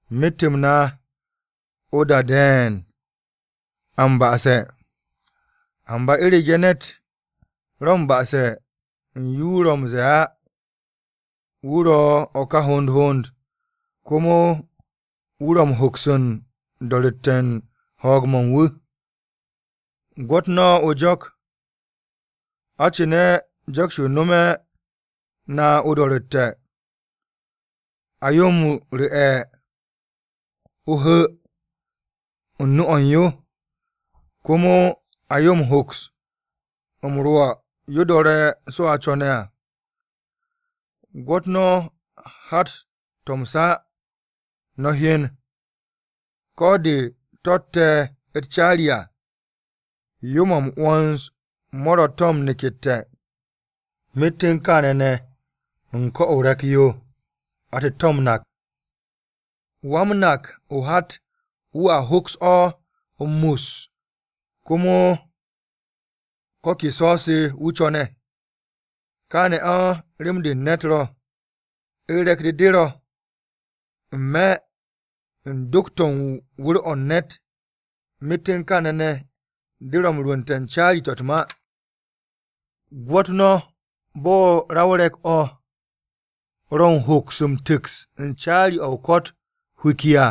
Myet-m na o-da de̱e̱n a m-ba'ase̱. Amba u̱rege̱ ne̱t ro̱ m-ba'ase̱ u̱n yo wu̱ ro̱ m-ze̱e̱ á, wu̱ ro̱ o̱ ka hond hond, komo wu̱ ro̱ m-hoks u̱n do̱ru̱tte̱ u̱n ho̱o̱g-mo̱ u̱n wu̱. Gwo̱t no̱ o-jo̱k. A cu̱ne̱ jo̱k-yo nomo na o-do̱ro̱tte̱, a yo m-ru̱'e̱ o-hu̱ u̱n nu-o̱ u̱n yo, komo a yo m-hoks m-rwo̱ yo do̱re̱ so̱ a co̱ne̱ à. Gwo̱t no̱ hat-to̱ m-sa no̱ hyen, ko̱ de to̱tte̱ u̱t-caari à, yo-mo̱ m-'wo̱ns mo̱ ro̱ to̱ m-nekette̱, myet u̱n kaane̱ ne̱ u̱n ko̱-o re̱k-yo atte̱-to̱ m-nak, wa-m-nak o-hat wu̱a hoks o̱ m-mus komo ko̱ ke co̱-se wu̱ co̱ne̱. Kaane̱ o̱ rem-de u̱n ne̱t ro̱, u̱r-re̱k-de de ro̱ n-me̱ u̱n do̱k-to̱ u̱n wu̱r-o̱ u̱n ne̱t, myet u̱n kaane̱ ne̱ de ro̱ m-rwu̱nte̱ caari-to̱ u̱t-ma. Gwo̱t no̱ bo̱ ra o-re̱k o̱ ro̱ u̱n hoks m-tu̱ks u̱n caari o-ko̱t hwiki à!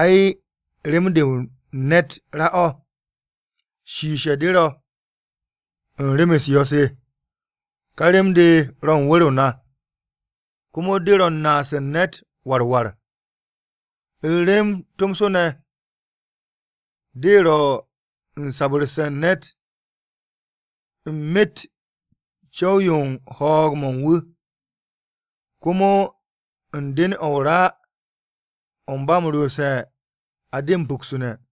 Ai rem-de u̱n ne̱t ra-o̱, shiishe̱ de ro̱ u̱n rem-u̱s yo̱-se! Ka rem-de ro̱ u̱n wu̱r-o na, komo de ro̱ u̱n naas u̱n ne̱t war war. U̱r-rem tomso ne̱, de ro̱ u̱n sabu̱rse̱ u̱n ne̱t u̱n myet co̱w-yo u̱n ho̱o̱g-mo̱ u̱n wu̱. Komo u̱n den-o̱ o-ra o̱ ba m-ryomse̱ a de m-puktune̱.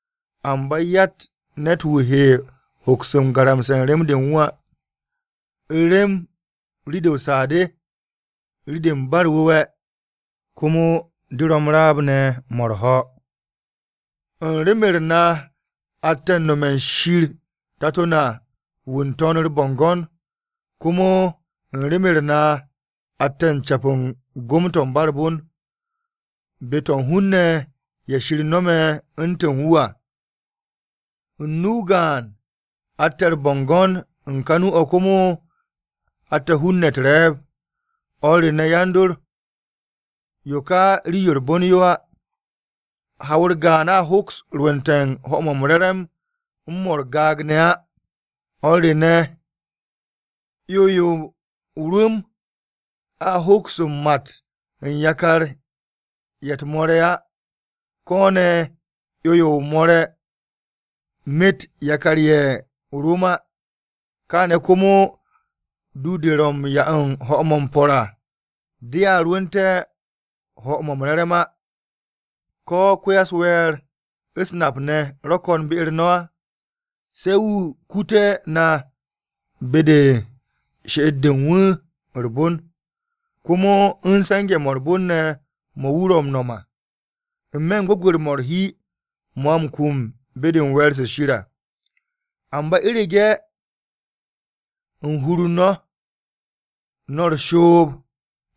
Amba yatt ne̱t-wu̱ he hoks u̱n garamse̱ rem-de u̱n wu̱ á. U̱r-rem rii-de o-saa de rii-de ba u̱r-wu̱we̱, komo de ro̱ m-raab ne̱ mo̱ u̱r-ho̱. U̱n rem-u̱r na atte̱ u̱n nome̱ u̱n Wan-Ko̱yan, Tato na wu̱ n-To̱n u̱r-bo̱ngo̱n. Komo u̱n rem-u̱r na, atte̱ u̱n ce̱p u̱n gom-to̱ u̱n ba u̱r-bon, be-to̱ u̱n hun-ne̱ ye̱ Shir nome̱ u̱ntu̱n wu̱ à. U̱n nu-o gaan atte̱ u̱r-bo̱ngo̱n u̱n ka nu-o̱ komo atte̱ hun-ne̱ u̱t-re̱e̱b. O̱r re ne̱ yan-dor, yo ka rii-yo u̱r-bon yo á! Haw-u̱r gaan a hoks rwu̱nte̱ ho̱-mo̱ m-re̱re̱m u̱n mo̱ u̱r-gaag ne̱ á. O̱r re ne̱, 'yo-yo o-rum a hoks m-mat u̱n yakar-ye̱ u̱t-moore̱ á, ko̱ ne̱, 'yo-yo o-moore̱ met yakar-ye̱ o-rum á. Kaane̱ komo du-de ro̱ m-'ya u̱n ho̱-mo̱ m-po̱r à, dea rwu̱u̱nte̱ ho̱-mo̱ m-re̱re̱m á. ¿Ko̱ ko-ya-u̱s-we̱e̱r u̱s-nap ne̱ ro̱ ko̱n be-u̱r no̱? Se̱ wu̱ kutu na be-de u̱n she'et-de u̱n wu̱ de u̱r-bon, komo u̱n se̱nge̱-mo̱ u̱r-bon ne̱ mo̱ wu̱ ro̱ m-no̱m à, n-me̱ u̱n gwu̱gwe̱r-mo̱ u̱r-hi, mo̱ a m-kum be-de we̱e̱r-se Shir à. Amba u̱rege̱ u̱n hur-u̱r no̱, no̱ u̱r-shoob,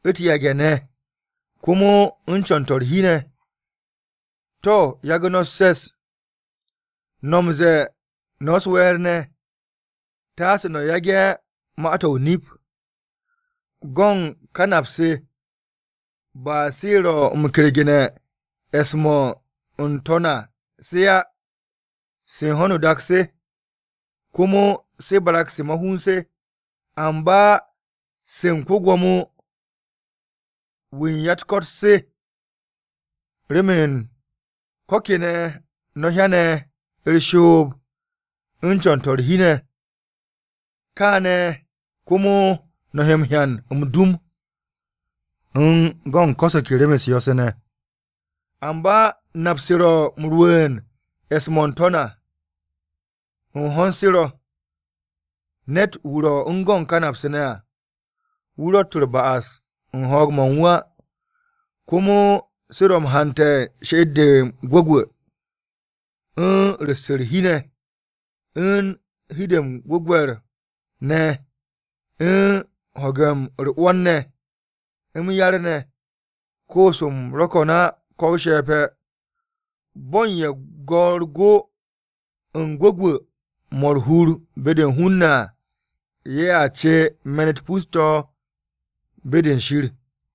u̱t-yage̱ ne̱, komo u̱n co̱n-to̱ u̱r-hi ne̱, to̱ yagu̱ no̱ u̱s-se̱s, no̱ m-ze̱e̱ no̱ u̱s-we̱e̱r ne̱. Taase no̱ yage̱ ma-to̱ o-nip. Go̱n ka nap-se ba se ro̱ m-kergu̱ne̱ e̱s-mo̱ n-To̱n à se á, se u̱n ho̱no o-dak se. Komo se barag-se ma-hun se, amba se u̱n ko-Gwo̱mo-wu̱ u̱n ya-u̱t-ko̱t se. Remen ko̱ kene̱ no̱ hyane̱ u̱r-shoob, u̱n co̱n-to̱ u̱r-hi ne̱, káne̱ komo no̱ he hyan m-dum, u̱n go̱n ko̱ se ke rem-u̱s yo̱-se ne̱. Amba nap-se ro̱ m-rwu̱u̱n e̱s-mo̱ u̱n n-To̱n à, u̱n ho̱n se ro̱. Ne̱t-wu̱ ro̱ u̱n go̱n ka napse̱ ne̱ à, wu̱ ro̱tt u̱r-ba'as u̱n ho̱o̱g-mo̱ u̱n wu̱ á. Komo se ro̱ m-hante̱ she'et-de m-gwu̱gwu̱, u̱n ru̱s u̱r-hi ne̱, u̱n hi-de m-gwu̱gwe̱r ne̱ u̱n ho̱ge̱ u̱r-'wo̱n ne̱, m-yar-ne̱, koos-m ro̱ ko̱n á ko̱ o-she̱pe̱. Bo̱ u̱n ye̱ go̱ u̱r-go u̱n gwu̱gwu̱-mo̱ u̱r-hur be-de hun-ne̱ à, ye̱a ce me̱n-u̱t pus-to̱ be-de u̱n Shir.